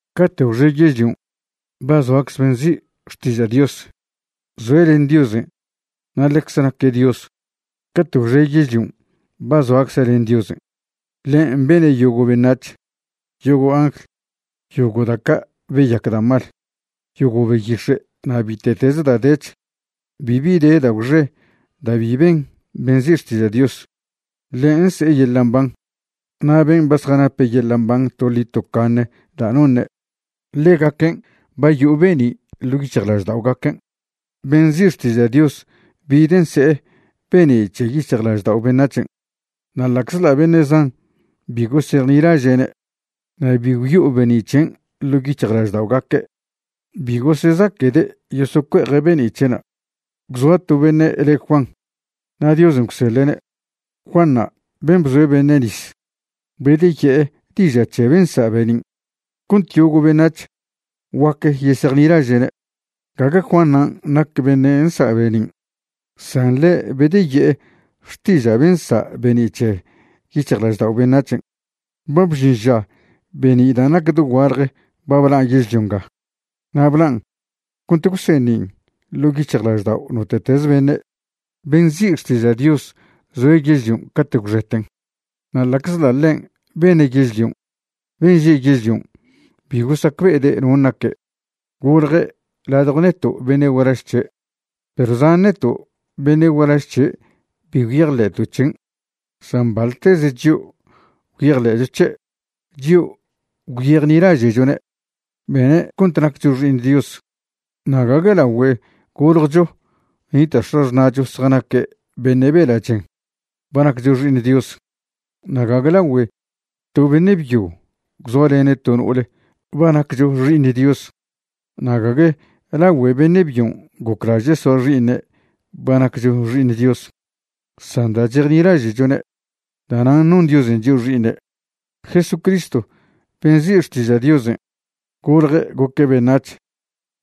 Cate' gwxe yežlion' ba zoacze ben' nzi' Xtiža' Dios. Zoe' len Diosen' na' ḻecze naque' Dios. Cate' gwxe yežlion' ba zoacze' len Diosen'. Ḻen' bene' yogo' beṉac̱h, yogo' angl, yogo' da' ca' beyac da' mal, yogo' beyix̱e' na' bite'teze da' dech. Bibi de da' gwxe da' bi ben ben' nzi' Xtiža' Dios. Ḻe' nse'e yeḻa' mban. Na' ben' ba zjanape' yeḻa' mban toḻi tocaṉe da' noṉe', ḻegaquen' ba yo'o be'ni' ḻo' yic̱hjlažda'ogaquen'. Ben' nzi' Xtiža' Dios bide' nse'e be'ni' c̱he yic̱hjlaždao' beṉac̱hen', na' ḻa'czḻa' beṉe' zan bi gosejnilaže'ne' na' bi gwyo'o be'ni' c̱hen' ḻo' yic̱hjlažda'ogaque', bi gosezaquede' yosocue'eje' be'ni' c̱he'na'. Gwzoa to beṉe' le Juan, na' Diosen' gwseḻe'ne'. Juanṉa' ben' bzoe' beṉe' nis bedeye'e diža' c̱he ben' nsa' be'nin', cont yogo' beṉac̱h guac yesejnilaže'ne'. Gague Juanṉan' nac beṉe' nsa' be'nin', san ḻe' bedeye'e xtiža' ben' nsa' be'ni' c̱he yic̱hjlaždao' beṉac̱hen'. Ba bžin ža be'ni' da' nac da' dogualje ba blan' yežlio nga, na' blan' cont gwseṉin' ḻo' yic̱hjlaždao' note'teze beṉe'. Ben' nzi' Xtiža' Dios zoe' yežlion' cate' gwxeten. Na' ḻa'czḻa' ḻen' bene' yežlion' ben' že' yežlion' bi gosacbe'ede' non' naque'. Golje' ladjo neto' beṉe' gualaž c̱he', perw zan neto' beṉe' gualaž c̱he' bi gwyejḻe'to' c̱hen'. San baḻteze chio' gwyejḻe'cho c̱he', chio' gwyejnilaže'chone', bene' cont naccho xi'iṉ Dios. Na' gague lagüe goljcho nita' x̱axṉa'cho zjanaque' beṉe' bela' chen ba naccho xi'iṉ Dios. Na' gague lagüe to beṉe' byo gwzoalene' to no'ole ba naccho xi'iṉ Dios, na' gague lagüe beṉe' byon' goclaže' soa xi'iṉe' ba naccho xi'iṉ Dios, san da' chejnilaže'chone', da'nan' non Diosen' chio' xi'iṉe'. Jesucristo ben' nzi' Xtiža' Diosen' golje' goque' beṉac̱h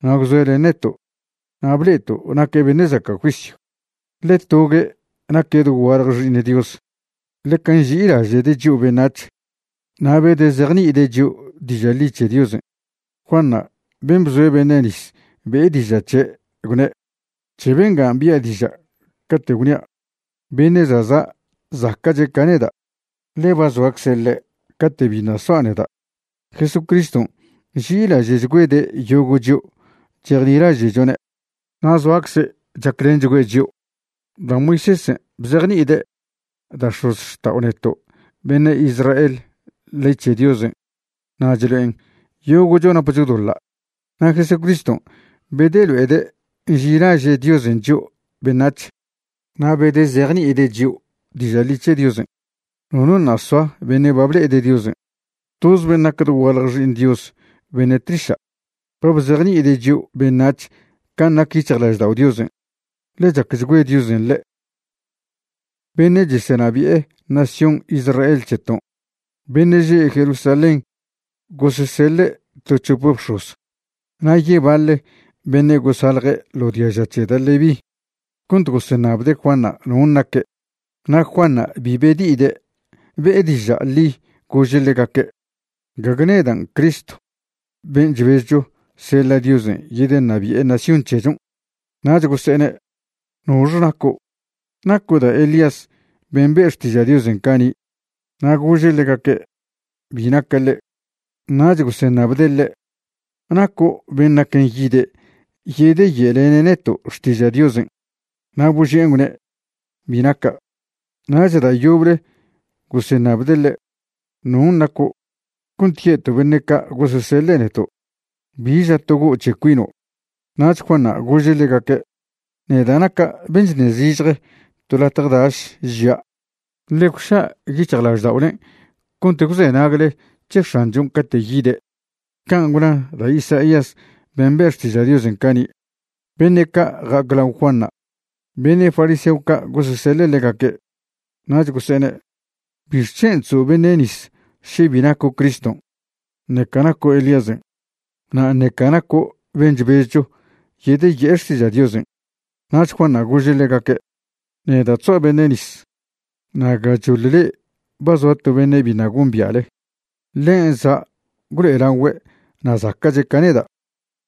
na' gwzoe' len neto'. Na' ble'eto' naque' beṉe' zaca' juisyw, ḻe togue' naque' dogualje Xi'iṉ Dios. Ḻeca nži'ilaže'de' chio' beṉac̱h na' bedezejni'ide' chio' diža' ḻi c̱he Diosen'. Juanṉa' ben' bzoe' beṉe' nis be'e diža' c̱he', gwne': ―C̱he bengan' bi'a diža' cate' gwnia': “Beṉe' za' za' zaca'che' ca neda', ḻe ba zoacze ḻe' cate' biṉa' soa' neda'.” Jesucriston' nži'ilaže'chgüede' yogo' chio' chejnilaže'chone' na' zoacze' chaclenchgüe' chio'. Da' Moisésen' bzejni'ide' da' x̱ozxta'o neto' beṉe' Israel ley c̱he Diosen' na' chlo'en yogo'cho napcho doḻa', na' Jesucriston' bedelo'ede' nži'ilaže' Diosen' chio' beṉac̱h na' bedezejni'ide' chio' diža' ḻi c̱he Diosen'. Nono ṉa' soa beṉe' ba ble'ede' Diosen'. Toz ben' nac dogualje Xi'iṉ Dios beṉe' tliša' ba bzejni'ide' chio' beṉac̱h can' nac yic̱hjlaždao' Diosen', ḻe chacchgüe Diosen' ḻe'. Beṉe' chesenabi'e nación Israel c̱heton' beṉe' že' Jerusalén gososeḻe' to c̱hope bx̱oz na' yebaḻe beṉe' gosalje ḻo diaža c̱he da' Leví cont goseṉabde' Juanṉa' non' naque'. Na' Juanṉa' bi bedi'ide', be'e diža' ḻi gože' ḻegaque': ―Gague nedan' Cristo ben' chbezcho seḻa' Diosen' yedeṉabi'e nación c̱hechon'. Nach gose'ene': ―¿Nox naco'? ¿Naco' da' Elías ben' be' xtiža' Diosen' cani'? Na' gože' ḻegaque': ―Bi naca' ḻe'. Nach goseṉabde' ḻe': ―¿Naco' ben' naquen yide' yedeye'lene' neto' xtiža' Diosen'? Na' boži'en gwne': ―Bi naca'. Nach da' yoble goseṉabde' ḻe': ―¿Non' naco'? cont ye'to' beṉe' ca' goseseḻe' neto'. ¿Bi ža togo' c̱he cuino'? Nach Juanṉa' gože' ḻegaque': ―Neda' naca' ben' chṉe zižje to latje daš, žia': “Ḻe gwža' yic̱hjlažda'olen' cont gwzenagle c̱he X̱anchon' cate' yide'”, can' gwna da' Isaías ben' be' xtiža' Diosen' cani'. Beṉe' ca' ja'ac lao Juanṉa', beṉe' fariseo ca' goseseḻe' ḻegaque'. Nach gose'ene': ―¿Bixc̱hen' chzo' beṉe' nis še bi naco' Criston' ṉeca naco' Elíasen' na' ṉeca naco' ben' chbezcho yedeye'e xtiža' Diosen? Nach Juanṉa' gože' ḻegaque': ―Neda' chzoa' beṉe' nis, na' gachoḻ le'e ba zoa to beṉe' biṉa' gombia'le. Ḻen' za' gwlo'elagüe' na' zaca'che' ca neda',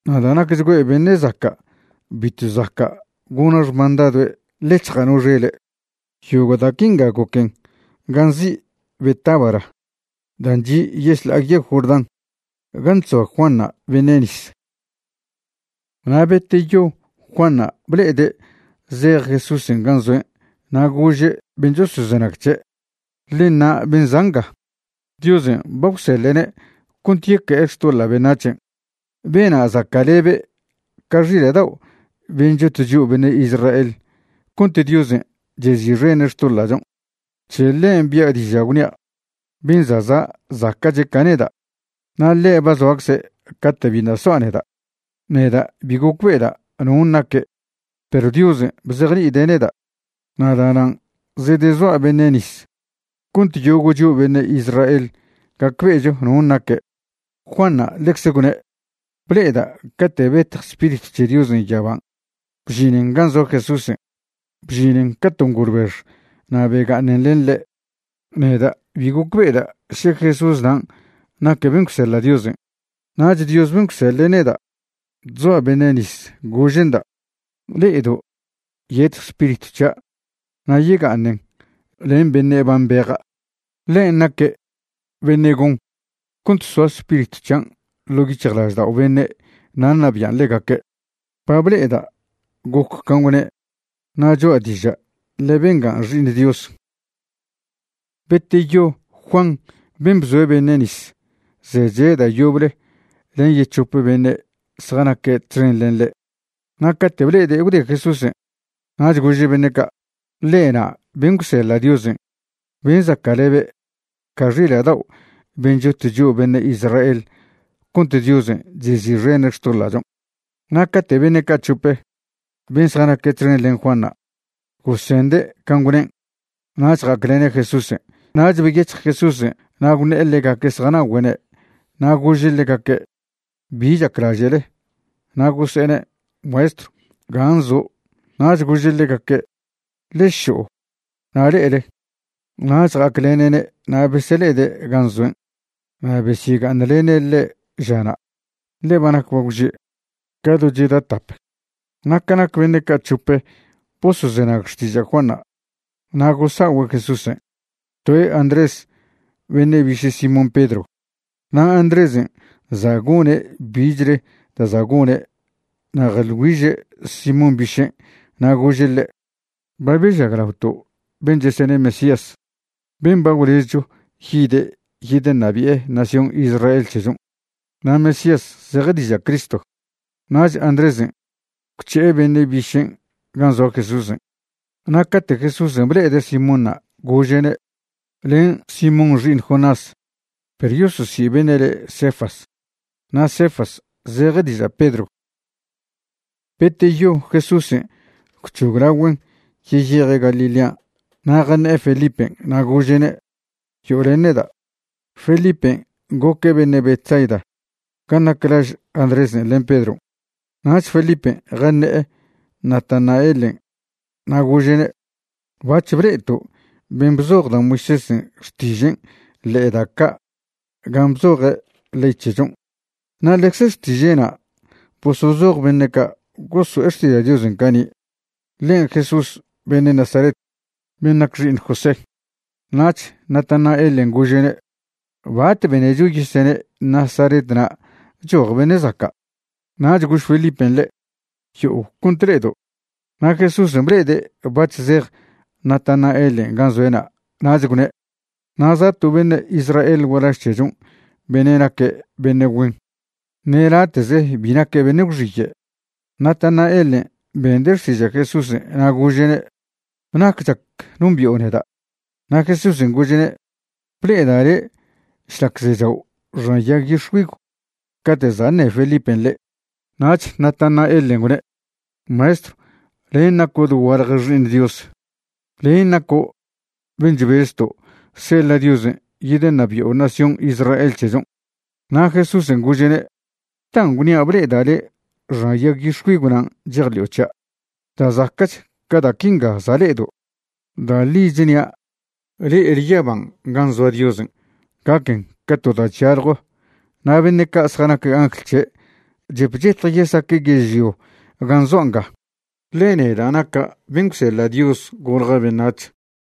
na' da' nacchgüe' beṉe' zaca' bitw zaca' gona xmandadoe' ḻec̱hja' no xele'. Yogo' da' quinga goquen gan' nzi' Betábara dan' chi' yešḻa'a yegw Jordán gan' chzoa Juanṉa' beṉe' nis. Na' beteyo Juanṉa' ble'ede' zej Jesúsen' gan' zoen' na' gože' ben' chosozenag c̱he': ―Ḻe ṉa' ben' za' nga, Diosen' ba gwseḻe'ne' cont yeque'e xtoḻa' beṉac̱hen'. Bena' zaca'lebe' ca xila' dao' ben' chot chio' beṉe' Israel cont Diosen' chezi'xene' xtoḻa'chon'. C̱he ḻen' bi'a diža', gwnia': “Ben' za' za' zaca'che' ca neda', na' ḻe' ba zoacze' cate' biṉa' soa' neda'.” Neda' bi gocbe'eda' non' naque' perw Diosen' bzejni'ide' neda', na' da'nan' zedezoa' beṉe' nis cont yogo' chio' beṉe' Israel gacbe'echo non' naque'. Juanṉa' ḻecze gwṉe': ―Ble'eda' cate' betj Spiritw c̱he Diosen' yaban' bžinen gan' zoa Jesúsen'. Bžinen ca to ngolbex na' bega'aṉen len ḻe'. Neda' bi gocbe'eda' še Jesús nan' naque' ben' gwseḻa' Diosen', nach Dios ben' gwseḻe' neda' chzoa' beṉe' nis gože'nda': “Le'edo' yetj Spiritw c̱hia' na' yega'aṉen len beṉe' ba mbeja'. Ḻen' naque' beṉe' gon cont soa Spiritw c̱hian' ḻo' yic̱hjlaždao' beṉe' na' ṉabian' ḻegaque'.” Ba ble'eda' goc can' gwne' na' cho'a diža' ḻe bengan' Xi'iṉ Dios. Beteyo Juan ben' bzoa beṉe' nis zeche' da' yoble len yec̱hope beṉe' zjanaque' txen len ḻe'. Na' cate' ble'ede' gwde Jesúsen', nach gože' beṉe' ca': ―Ḻe ṉa' ben' gwseḻa' Diosen' ben' zaca'lebe' ca xila' dao' ben' chot chio' beṉe' Israel cont Diosen' chezi'xene' xtoḻa'chon'. Na' cate' beṉe' ca' c̱hope, ben' zjanaque' txen len Juanṉa', gosende' can' gwnen' nach ja'aclene' Jesúsen'. Nach beyec̱hj Jesúsen' na' gwṉe'e ḻegaque' zjana'ogüe'ne', na' gože' ḻegaque': ―¿Bi chaclaže'le? Na' gose'ene': ―Maestrw, ¿gan' zo'? Nach gože' ḻegaque': ―Ḻe šo'o na' le'ele. Nach ja'aclene'ne' na' besele'ede' gan' zoen', na' besyega'aṉlene' ḻe' žana', ḻe ba nac bagwže', ca do cheda tap. Na ca nac beṉe' ca' c̱hope' bosozenag xtiža' Juanṉa' na' gosa'ogüe' Jesúsen', toe' Andrés, beṉe' biše' Simón Pedro. Na' Andrésen' za' gone' bichle da' za' gone' na' jeḻ güiže' Simón bišen' na' gože' ḻe': ―Ba bežaglaoto' ben' chesene' Mesías, ben' ba gwlezcho yide' yedeṉabi'e nación Israel c̱hechon'. ―Na' Mesías zeje diža' Cristo. Nach Andrésen' gwc̱he'e beṉe' bišen' gan' zoa Jesúsen'. Na' cate' Jesúsen' ble'ede' Simónṉa' gože'ne': ―Len' Simón xi'iṉ Jonás. Perw yososi' beṉe' le' Cefas. (Na' Cefas zeje diža' Pedro.) Beteyo Jesúsen' gwc̱hoglagüen' yeyeje' Galilean' na' jaṉe'e Felipen' na' gože'ne': ―Yo'o len neda'. Felipen' goque' beṉe' Betsaida gan' nac laž Andrésen' len Pedron'. Nach Felipen' jaṉe'e Natanaelen' na' gože'ne': ―Bac̱h ble'eto' ben' bzoj da' Moisésen' xtižen' ḻe'e da' ca' gan' bzoje' ley c̱hechon', na' ḻecze xtiže'na' bosozoj beṉe' ca' goso'e xtiža' Diosen' cani'. Ḻen' Jesús beṉe' Nazaret, ben' nac xi'iṉ José. Nach Natanaelen' gože'ne': ―¿Bat benecho yesene' Nazaret na' choj beṉe' zaca'? Nach gož Felipen' ḻe': ―Yo'o cont le'edo'. Na' Jesúsen' ble'ede' bac̱h zej Natanaelen' gan' zoe'na' nach gwne': ―Na' za' to beṉe' Israel gualaž c̱hechon' beṉe' naque' beṉe' güen. Ṉe late'ze bi naque' beṉe' gwxiye'. Natanaelen' bende' xtiža' Jesúsen' na' gože'ne': ―¿Nac chac nombi'o neda? Na' Jesúsen' gože'ne': ―Ble'eda' le' šlac zechao' xan yag yix̱güigw cate' za' ṉe Felipen' le'. Nach Natanaelen' gwne': ―Maestrw, len' naco' dogualje Xi'iṉ Dios. Len' naco' ben' chbezto' seḻa' Diosen' yedeṉabi'o nación Israel c̱hechon'. Na' Jesúsen' gože'ne': ―¿Da' gwnia' ble'eda' le' xan yag yix̱güigw nan' chejḻi'o c̱hia'? Da' zaca'ch ca da' quinga za' le'edo'. Da' ḻi chnia', le'ele yaban' gan' zoa Diosen' gaquen ca to da' chyaljo na' beṉe' ca' zjanac angl c̱he' chep chetj yesaque' yežlio gan' zoa' nga, ḻe neda' naca' ben' gwseḻa' Dios golja' beṉac̱h.